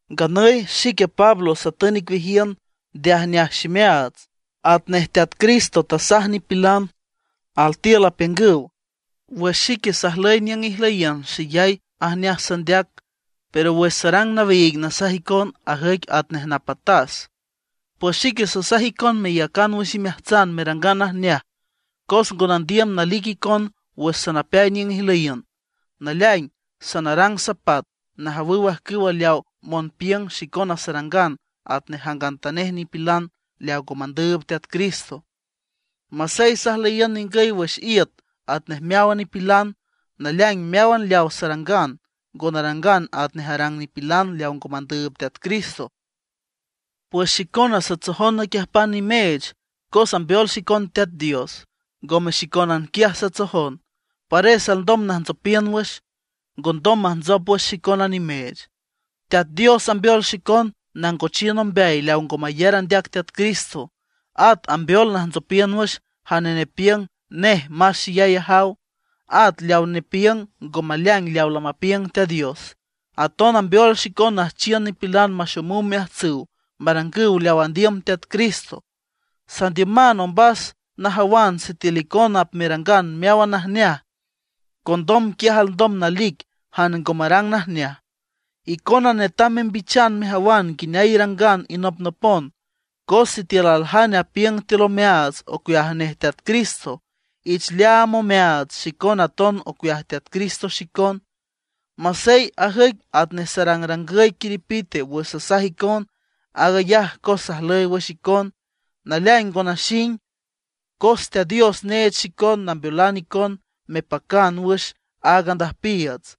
Nganüy xique Pablo satün icueajiün nde ajneaj ximeaats, atnej Teat Cristo tasaj nipilan. Altiül apiüngüw, wüx xique sajlüy niüng ijlüyiün xeyay ajneaj sandeac, pero wüx sarang nawiig nasaj icon, ajüic atnej napatas. Pues xique sasaj icon meyacan wüx imeajtsan merangan najneaj, cos ngo nandiüm nalic icon wüx sanapeay niüng ijlüyiün. Naleaing sanarang sapat najawüw ajcüwa leawa monpiüng xicona sarangan atnej jangantanej nipilan leaw ngo mandüüb Teat Cristo. Masey sajlüyiün ningüy wüx iüt atnej meáwan nipilan, naleaing meáwan leaw sarangan ngo narangan atnej arang nipilan leaw ngo mandüüb Teat Cristo. Pues xicona satsojon naquiüjpan nimeech cos ambeol xicon Teat Dios. Ngome xicónan quiaj satsojon, pares alndom najntsopiün wüx, ngondom majntsop wüx xicona nimeech. Teat Dios ambeol xicon nangochiün ombeay leaw ngo mayar andeac Teat Cristo; at ambeol najntsopiün wüx jane nepiüng nej más xeyay ajaw, at leaw nepiüng ngo maleaing leaw lamapiüng Teat Dios. Aton ambeol xicon nüjchiün nipilan maxomüw omeajtsüw marangüw leaw andiüm Teat Cristo. Sandiüman ombas najawan sitiül icona apmerangan meáwan najneaj, condom quiaj alndom nalic jane ngo marang najneaj. Icona netam membichan mejawan nguineay irangan inopnopon. Cos sitiül aljane apiüng tiül omeaats ocueaj nej Teat Cristo, ich leaam omeaats xicona aton ocueaj Teat Cristo xicon. Masey ajüic atnej sarangrangüy quiripite wüx sasaj icon, aag ayaj cos sajlüy wüx icon. Naleaing ngo naxing, cos Teat Dios neech xicon nambeolan icon mepacan wüx áag andüjpiiüts,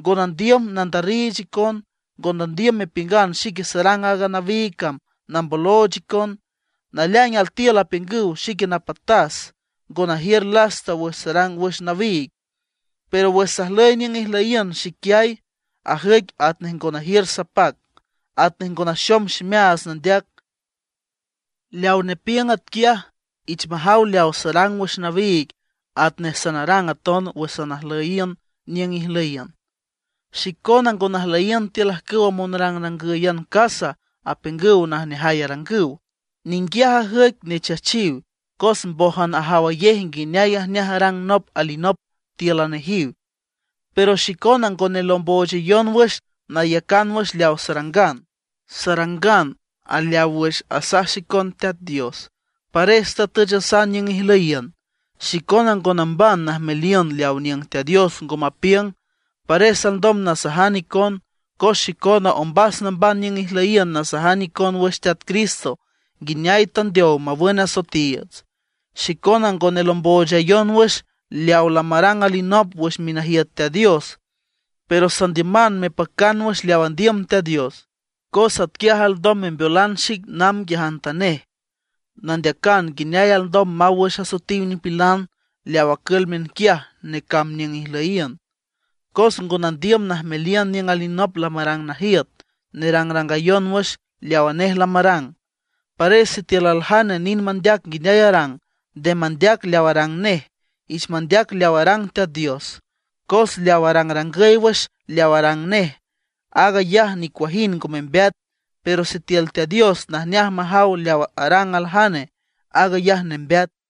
ngo nandiüm nandarriich icon. Ngo nandiüm mepiüngan xique sarang aaga nawiig cam nambolooch icon. Naleaing altiül apiüngüw xique napatas, ngo najiür lasta wüx sarang wüx nawiig; pero wüx sajlüy niüng ijlüyiün xiquiay, ajüic atnej ngo najiür sapac, atnej ngo naxom ximeaats nandeac. Leaw nepiüng atquiaj, ich majaw leaw sarang wüx nawiig atnej sanarang aton wüx sanajlüyiün niüng ijlüyiün. Xicona ngo najlüyiün tiül ajcüwa monrangǘyan casa, apiüngüw najneajay arangüw. Ninguiaj ajüic nechachiw, cos mbójan ajawayej nguineay najneaj arang nop alinop tíülan nejiw. Pero xicona ngo nelomboochayon wüx nayacan wüx leaw sarangan, sarangan aleaw wüx asaj xicon Teat Dios. Pares tatüchasan niüng ijlüyiün. Xicona ngo namban najmeliün leaw niüng Teat Dios ngo mapiüng. Pares alndom nasajan icon, cos xicona ombas namban niüng ijlüyiün nasajan icon wüx Teat Cristo nguineay tandeow mawün asoetiiüts. Xicona ngo nelomboochayon wüx leaw lamarang alinop wüx minajiüt Teat Dios. Pero sandiüman mepacan wüx leaw andiüm Teat Dios, cos atquiaj alndom membeolan xic namb nguiajantanej, nandeacan nguineay alndom maw wüx asoetiw nipilan leaw acül miünquiaj necamb niüng ijlüyiün. Cos ngo nandiüm najmeliün niüng alinop lamarang najiüt, nerangrangayon wüx leawa nej lamarang. Pares sitiül aljane nind mandeac nguineay arang, nde mandeac leaw arang nej, ich mandeac leaw arang Teat Dios. Cos leaw arangrangüy wüx leaw arang nej, aag ayaj nicuajind ngo membeat; pero sitiül Teat Dios najneaj majaw leaw arang aljane, aag ayaj nembeat.